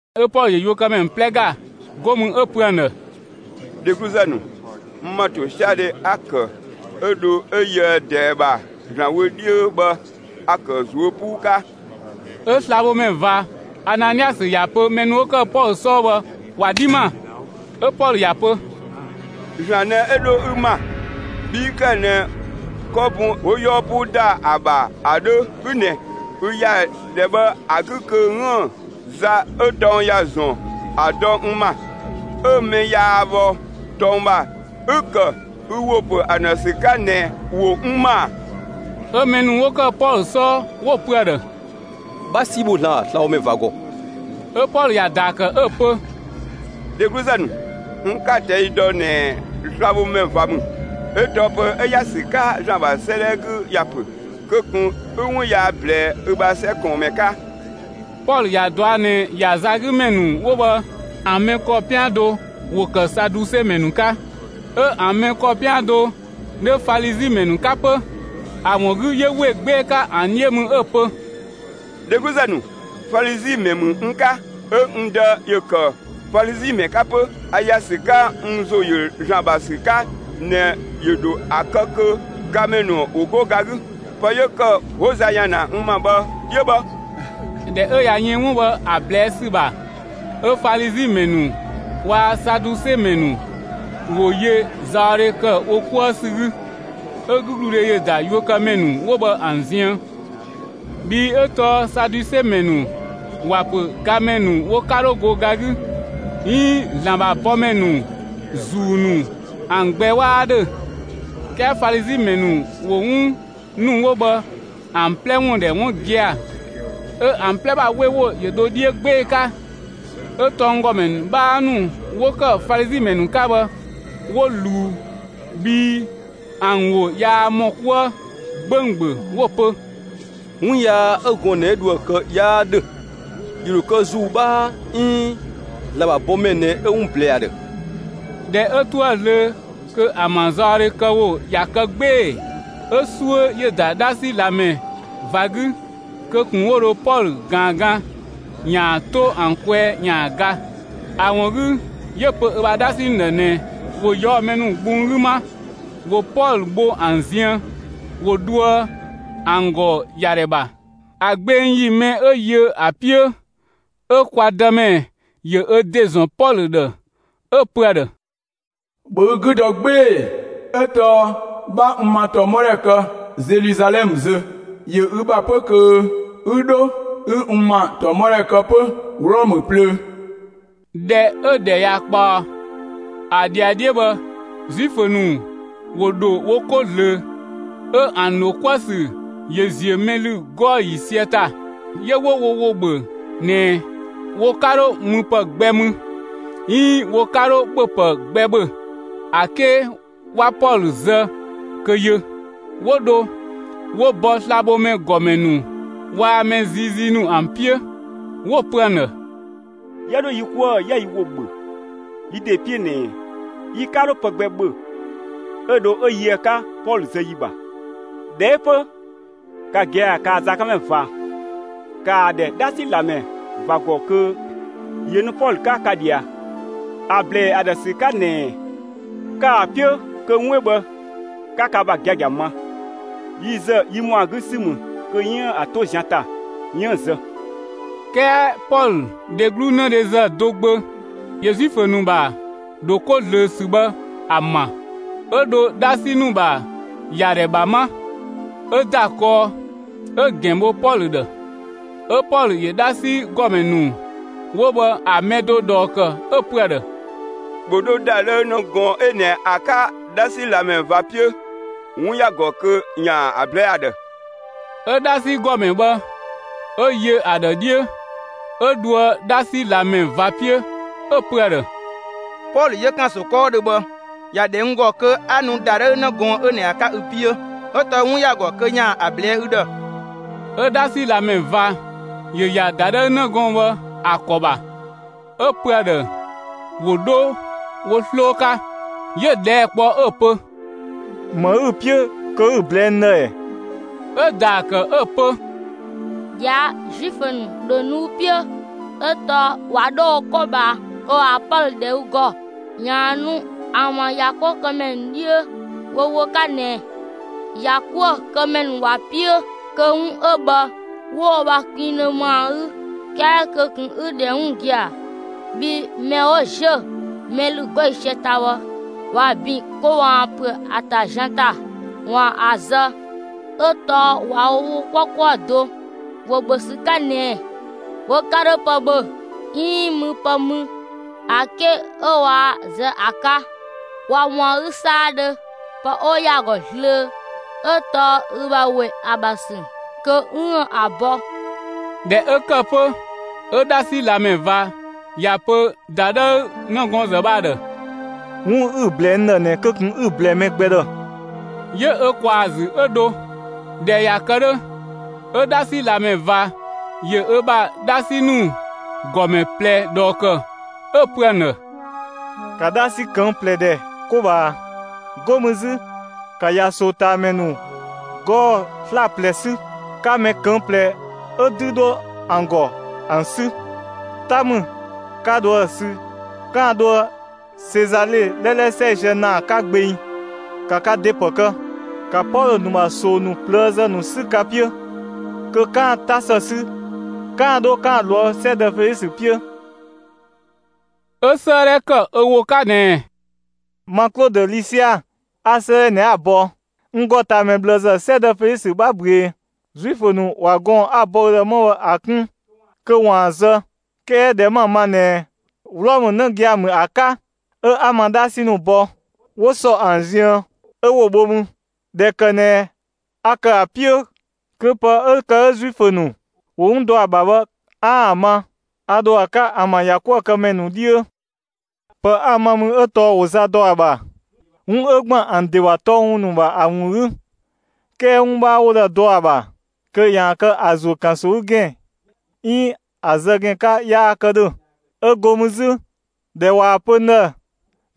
'Ö Pɔlö ‑yö ‑yakuëkëmɛ ‑nu 'plɛ ‑ga, 'go mü 'ö‑ pö ‑an ‑dhë: «Dhegluzë ‑nu, n ‑ma ‑tosiadhe 'a‑ ‑kë 'ö dho 'ö yöë ꞊dɛɛ ‑bha ‑Zlan wö 'dhiö bhë, a‑ ‑kë ꞊zuö' 'puu 'ka.» 'Ö slabhomɛ ꞊va Ananiasö ‑ya pö mɛ ‑nu 'wo ‑kë Pɔlö 'sɔɔ bhë ‑wa 'dhi ‑ma. 'Ö Pɔlö ‑ya pö: «‑Zlan ꞊nɛ 'ö dho ü ‑ma, bhi 'ü ‑kë ꞊nɛ 'kɔ bun 'ö 'wo 'yɔɔ 'puu ‑da ‑a ‑bha bhë ‑a 'dhö 'ü ꞊nɛ! Ü ‑ya ‑dhɛ bhë ‑a 'gü kö 'üën‑ za 'ö tɔng ‑ya ‑zɔn ‑a dɔ n ‑ma, 'ö‑ mɛ yaa bhɔ tɔng ‑bha, 'ü‑ ‑kë ü ‑wo ‑pö ‑an ‑dhë ‑sü 'ka ꞊nɛ, ‑wo n ‑ma ‑a!» 'Ö mɛ ‑nu 'wo ‑kë Pɔlö 'sɔɔ 'wo‑ pö ‑a ‑dhë: «'Bha 'si bho ‑Zlan ‑bha slabhomɛ ꞊va ‑gɔ!» 'Ö Pɔlö ‑ya ‑daa ‑kë 'ö‑ pö: «Dhegluzë ‑nu, n 'ka‑ ꞊tɛi' dɔ ꞊nɛ slabhomɛ ꞊va ‑mü, 'ö tɔɔ pë 'ö ‑ya ‑sü 'ka ‑Zlan ‑bha 'sëëdhɛ 'gü ‑ya ‑pö: Kö ꞊kun 'ü 'wun yaa ꞊blɛɛ ü ‑bha 'sɛ ꞊kɔɔnmɛ 'ka!» Pɔlö ‑ya ꞊dɔa' ꞊nɛ ‑ya za 'gü ‑mɛ ‑nu 'wo bhë ‑an mɛ ‑kɔ 'pian do ‑wo ‑kë Saduse ‑mɛ ‑nu 'ka, 'ö ‑an mɛ ‑kɔ 'pian do 'dhö Falizi ‑mɛ ‑nu 'ka 'pö. ‑A ‑wun 'gü 'yö ‑we 'gbee‑ 'ka ‑an 'dhiö mü 'ö‑ pö: «Dhegluzë ‑nu, Falizi ‑mɛ ‑mü n 'ka, 'ö n dë ‑yö ‑kë Falizi ‑mɛ 'ka 'pö. A ‑ya ‑sü 'ka n ‑zo ‑yö ‑Zlan ‑bha ‑sü 'ka ꞊nɛ ‑yö ‑dho ‑a kë kö gamɛ ‑nu ‑wo 'go ga 'gü. Pë 'yö ‑kë 'wo za ‑ya ‑na n ‑ma bhë 'yö bhë.» ꞊Dhɛ 'ö ꞊ya yën 'wun bhë ‑a ꞊blɛɛ' ‑sü ‑bha, 'ö Falizi ‑mɛ ‑nu waa‑ Saduse ‑mɛ ‑nu ‑wo yö zaɔdhe ‑kë wo 'kuë ‑sü 'gü. 'Ö 'gügludhe ‑yö ‑da ‑yakuëkëmɛ ‑nu 'wo bhë ‑an ziën. Bhii 'ö tɔɔ Saduse ‑mɛ ‑nu ‑wa ‑pö gamɛ ‑nu wo 'ka 'dho go ga 'gü, 'iin ‑Zlan ‑bha bɔmɛ ‑nu, ‑zuu ‑nu ‑an gbɛ 'waa 'dhö, 'kɛɛ Falizi ‑mɛ ‑nu ‑wo 'wun ‑nu 'wo bhë ‑an 'plɛ ‑wun ‑dhɛ 'wun gia‑. 'Ö ‑an 'plɛ ‑bha 'we ‑wo ‑yö dho 'dhiö 'gbee‑ 'ka. 'Ö tɔnggɔmɛ ‑nu 'bhaa ‑nu 'wo ‑kë Falizi ‑mɛ ‑nu 'ka bhë, 'wo ꞊luu bhii ‑an ‑wo yaa ‑mɔ 'kuë 'gbönggböng 'wo‑ pö: «'Wun yaa 'ö gɔɔn‑ ꞊nɛ 'ö dho ‑a kë 'yaa ‑dhö. ‑Yö ‑dho kë ‑zuu 'bhaa 'iin ‑Zlan ‑bha bɔmɛ ꞊nɛ 'ö 'wun ꞊blɛɛ ‑a ‑dhë.» ꞊Dhɛ 'ö 'toë‑ zlöö kö ‑an ‑bha zaɔdhekëwo ꞊ya kë 'gbee‑, 'ö 'suö ‑yö ‑da 'dhasi ꞊lamɛ ꞊va 'gü kö ꞊kun 'wo dho Pɔlö ꞊gaan gan ‑yaan 'to ‑an kwɛɛ ‑yaan ga. ‑A ‑wun 'gü 'yö‑ pö ö ‑bha 'dhasi ‑nu ‑dhë ꞊nɛ ‑wo ꞊yɔɔ'‑ mɛ ‑nu gbung 'gü 'ma, ‑wo Pɔlö bho ‑an ziën, ‑wo dhoë ‑an ‑gɔ ‑yadhɛ ‑bha. ‑A gbeng ‑yi mɛ 'ö yö ‑a 'piö, 'ö kwa Dëmɛ ‑yö ö ‑de ‑zɔn Pɔlö ‑dhë 'ö‑ pö ‑a ‑dhë: «‑Bhö ü 'gü dɔ 'gbee‑! 'Ö tɔɔ 'bha n ‑ma ‑tɔmɔdhɛ kë Zeluzalɛmë zö. ‑Yö ü ‑bha 'pö kö 'ü 'dho 'ü n ‑ma ‑tɔmɔdhɛ kë 'pö Wlɔmë plöö.» ꞊Dhɛ 'ö ‑dhɛ ꞊ya ꞊kpaɔ, ‑a ‑dhiadhiö bhë, Zuifö ‑nu ‑wo ‑dho wo 'ko ꞊zlöö, 'ö ‑an ‑dho 'kuë‑ ‑sü ‑yö ‑ziö mɛ ‑lü 'gɔɔ‑ ‑yiisië ‑ta; 'yö 'wo wo ‑wo ‑bhö ꞊nɛ wo 'ka 'dho müpë gbɛ mü, 'iin wo 'ka 'dho ‑bhöpë gbɛ ‑bhö, ‑a 'ke 'wa Pɔlö zë kö yö. 'Wo dho 'wo bɔ slabhomɛ ‑gɔmɛ ‑nu waa‑ mɛ ziizii ‑nu ‑an 'piö, 'wo‑ pö ‑an ‑dhë: «'Yië 'dho yi 'kuë‑ 'yië yi ‑wo ‑bhö yi ‑de 'piö ꞊nɛ, yi 'ka 'dho pë gbɛ ‑bhö 'ö dho 'ö yöë ‑a 'ka Pɔlö zë ‑yi ‑bha. ꞊Dhɛ 'ö 'pö, ka gia‑ kaa‑ zakanmɛ ꞊va, ‑kaa ‑dhɛ 'dhasi ꞊lamɛ ꞊va ‑gɔ kö ‑yö nu Pɔlö 'ka ka ꞊dhia, ‑a ꞊blɛɛ ‑a ‑dhë ‑sü 'ka ꞊nɛ, kaa‑ 'piö kö 'wun 'ö bhë 'ka ka ‑bha giagia ma. Yi ‑zë, yi ‑mɔa 'gü ‑sü ‑mü kö 'yiën‑ ‑a 'to zian ‑ta, 'yiën‑ zë.» 'Kɛɛ Pɔlö dheglu 'nëdhezë do gbö ‑yö Zuifö ‑nu ‑bha ‑dho 'ko ꞊zlöö ‑sü bhë ‑a ‑ma. 'Ö dho 'dhasi ‑nu ‑bha ‑yadhɛ ‑bha 'ma, 'ö ‑da kɔɔ 'ö‑ ‑gɛn ‑bho Pɔlö ‑dhë. 'Ö Pɔlö ‑yö 'dhasi ‑gɔmɛ ‑nu 'wo bhë ‑a mɛ do ꞊dhɔɔ ‑kë 'ö‑ pö ‑a ‑dhë: «‑Bhö 'dho ‑dadhëü 'në gɔɔn‑ 'ö ꞊nɛ ‑a 'ka 'dhasi ꞊lamɛ ꞊va 'piö! 'Wun ‑ya ‑gɔ kö ‑yaan ‑a ꞊blɛɛ'‑ ‑a ‑dhë.» 'Ö 'dhasi ‑gɔmɛ bhë, 'ö yö ‑a ‑dhë 'dhiö, 'ö dhoë 'dhasi ꞊lamɛ ꞊va 'piö, 'ö‑ pö ‑a ‑dhë: «Pɔlö 'yö ‑kanso 'kɔɔdhö bhë ‑ya ‑dhɛ n ‑gɔ kö 'a nu ‑dadhëü 'në gɔɔn‑ 'ö ꞊nɛ ‑a 'ka ü 'piö, 'ö tɔɔ 'wun ‑ya ‑gɔ kö ‑yaan ‑a ꞊blɛɛ'‑ ü ‑dhë.» 'Ö 'dhasi ꞊lamɛ ꞊va ‑yö ‑ya ‑dadhëü 'në gɔɔn‑ bhë ‑a ‑kɔ ‑bha, 'ö‑ pö ‑a ‑dhë ‑wo 'dho wo 'sloo 'ka, 'yö‑ ꞊dhɛɛ' kpɔ 'ö‑ pö: «‑Më ü‑ 'piö kö 'ü‑ ꞊blɛɛ'‑ n ‑dhë ‑ɛ?» 'Ö‑ ‑daa ‑kë 'ö‑ pö: «꞊Dhia' Zuifö ‑nu ‑dho nu ü 'piö; 'ö tɔɔ ꞊wa 'dho wo 'ko ꞊bhaa kö ‑waan Pɔlö ‑dhɛ ü ‑gɔ, ‑yaan nu ‑an ‑bha ‑yakuëkëmɛ nu 'dhiö wo ‑wo 'ka ꞊nɛ, ‑yakuëkëmɛ ‑nu ‑wa 'piö kö 'wun 'ö bhë 'wo wo ‑bha kpinngdhö ma ‑a 'gü. 'Kɛɛ kö ꞊kun 'ü‑ ‑dhɛ 'wun gia‑! Bhii mɛ 'wo ‑ziö mɛ ‑lü 'gɔɔ‑ ‑yiisië ‑ta bhë, ꞊wa ‑bin kö ‑waan ‑püö ‑a ‑ta zian ‑ta, ‑waan ‑a zë 'ö tɔɔ ꞊wa wo ‑wo 'kpɔ 'kuë‑ do, ‑wo ‑bhö ‑sü 'ka ꞊nɛ wo 'ka 'dho pë ‑bhö, 'iin müpë mü, ‑a 'ke 'ö waa‑ zë ‑a 'ka. ꞊Wa ‑mɔa 'gü 'saadhö, pë 'wo ‑yaa ‑gɔ zlöö 'ö tɔɔ ü ‑bha ‑we ‑a ‑bha ‑sü kö 'üën‑ ‑a bɔ.» ꞊Dhɛ 'ö ‑kë 'pö 'ö 'dhasi ꞊lamɛ ꞊va ‑ya pö ‑dadhëü 'nëgɔɔnzë bhë ‑a ‑dhë: «'Wun 'ü‑ ꞊blɛɛ n ‑dhë ꞊nɛ kö ꞊kun 'ü‑ ꞊blɛɛ mɛ gbɛ ‑dhë!» 'Yö ö ꞊kwaa‑ ‑zü 'ö dho. ꞊Dhɛ ꞊ya kë 'dhö, 'ö 'dhasi ꞊lamɛ ꞊va ‑yö ö ‑bha 'dhasi ‑nu ‑gɔmɛ ꞊plɛ ꞊dhɔɔ ‑kë, 'ö‑ pö ‑an ‑dhë: «‑Ka 'dhasi ꞊këng' ꞊plɛ ‑dhɛ 'ko ꞊bhaa! 'Go mü 'zü 'ka ‑ya ꞊soo ꞊taa ‑mɛ ‑nu 'gɔɔ‑ 'slaplɛ 'sü; 'ka mɛ ꞊këng' ꞊plɛ 'ö 'dü 'dhö ‑an ‑gɔ ‑an 'sü! 'Ta ‑mü, 'ka dho ‑a sü 'kaan‑ dhoë Sezale 'lɛlɛ 'sɛisië ‑naa 'ka gbeng; ‑ka ka ‑de ‑pë kë! ‑Ka Pɔlö ‑nu ‑bha ꞊soo ‑nu ꞊plëëzë ‑nu 'sü ka 'piö kö 'kaan‑ 'ta ‑së sü 'kaan‑ 'dho 'kaan‑ ꞊loë' 'sɛdë Felisö 'piö.» 'Ö 'sëëdhɛ ‑kë ö ‑wo 'ka ꞊nɛɛ: «Ma Klodö Lisia, 'a 'sëëdhɛ ꞊nɛ ‑a bɔ. N ‑gɔtaamɛ ꞊bhlëzë, 'sɛdë Felisö, 'bha ꞊büee! Zuifö ‑nu ꞊wa gɔɔn‑ 'a‑ bɔ ü ‑dhë 'ma bhë ‑a 'kun kö 'waan‑ ‑a zë. 'Kɛɛ ꞊dhɛ 'ma‑ ma ꞊nɛ Wlɔmë 'në gia‑ ‑mü ‑a 'ka, 'ö 'a ma 'dhasi ‑nu bɔ 'wo ‑sɔ ‑an ziën 'ö 'wo‑ bho mü. ꞊Dhɛ ‑kë ꞊nɛ a ‑kë ‑a 'piö kö pë 'ö ‑kë 'ö Zuifö ‑nu ‑wo 'wun dɔ ‑a ‑bha bhë 'aan‑ ‑a ma, 'a dho ‑a 'ka ‑an ‑bha ‑yakuëkëmɛ ‑nu 'dhiö. Pë 'a‑ ma mü 'ö tɔɔ ‑wo za ‑dɔ ‑a ‑bha, 'wun 'ö ‑gban ‑an ‑de ‑bha tɔng ‑nu ‑wun ‑bha ‑a ‑wun 'gü. 'Kɛɛ 'wun 'bhaa 'wo dho ‑a dɔ ‑a ‑bha kö ‑yaan kë ‑a ‑zuö ‑kanso 'gü ‑gɛn 'iin ‑a zë ‑gɛn 'ka yaa kë ‑dhö. 'Ö 'go mü 'zü, ꞊dhɛ ꞊waa‑ pö n ‑dhë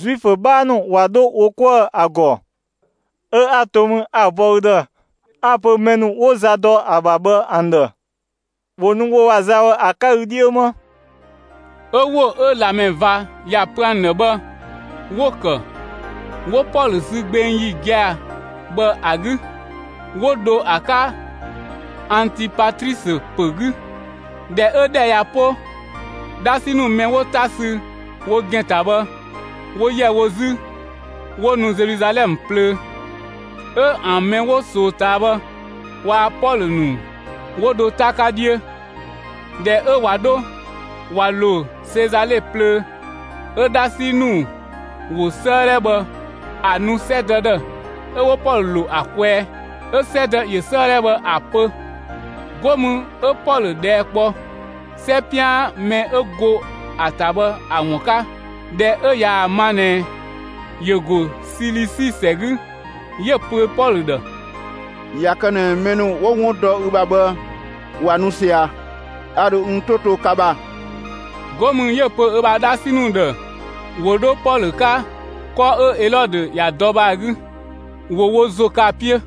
Zuifö 'bhaa ‑nu ꞊wa 'dho wo 'kuë‑ ‑a ‑gɔ, 'ö 'a to mü 'a‑ bɔ ü ‑dhë, 'a‑ pö mɛ ‑nu 'wo za dɔ ‑a ‑bha bhë ‑an ‑dhë ‑wo nu wo ‑bha za bhë ‑a 'ka ü 'dhiö 'ma.» 'Ö ‑wo 'ö ꞊lamɛ ꞊va ‑ya pö ‑an ‑dhë bhë, 'wo‑ ‑kë. 'Wo Pɔlö sü gbeng ‑yi gia‑ bhë ‑a 'gü, 'wo dho ‑a 'ka Antipatrisö ‑pö 'gü. ꞊Dhɛ 'ö ‑dhɛ ꞊ya 'po, 'dhasi ‑nu mɛ 'wo 'ta sü wo ‑gɛn ‑ta bhë, ‑wo ‑yɛ wo 'zü 'wo nu Zeluzalɛmë plöö, 'ö ‑an mɛ 'wo ꞊soo ꞊taa bhë waa‑ Pɔlö ‑nu 'wo dho 'ta 'ka 'dhiö. ꞊Dhɛ 'ö ꞊wa 'dho ꞊wa ‑lo Sezale plöö, 'ö 'dhasi ‑nu ‑wo 'sëëdhɛ bhë ‑a nu 'sɛdë ‑dhë, 'ö 'wo Pɔlö ‑lo ‑a kwɛɛ. 'Ö 'sɛdë ‑yö 'sëëdhɛ bhë ‑a pö. 'Go mü 'ö Pɔlö ꞊dhɛɛ' kpɔ 'sɛ 'pian mɛ 'ö go ‑a ‑ta bhë ‑a ‑wun 'ka. ꞊Dhɛ 'ö ꞊yaa‑ ma ꞊nɛ ‑yö ‑go Silisi ‑sɛ 'gü, 'yö‑ pö Pɔlö ‑dhë: «꞊Ya kë ꞊nɛ mɛ ‑nu 'wo 'wun dɔ ü ‑bha bhë ꞊wa nu ꞊sia, a ‑dho n 'to to ka ‑bha.» 'Go mü 'yö‑ pö ö ‑bha 'dhasi ‑nu ‑dhë ‑wo 'dho Pɔlö 'ka, 'kɔ 'ö Elɔdö ‑ya dɔ bhë ‑a 'gü, ‑wo wo ‑zo kë ‑a 'piö.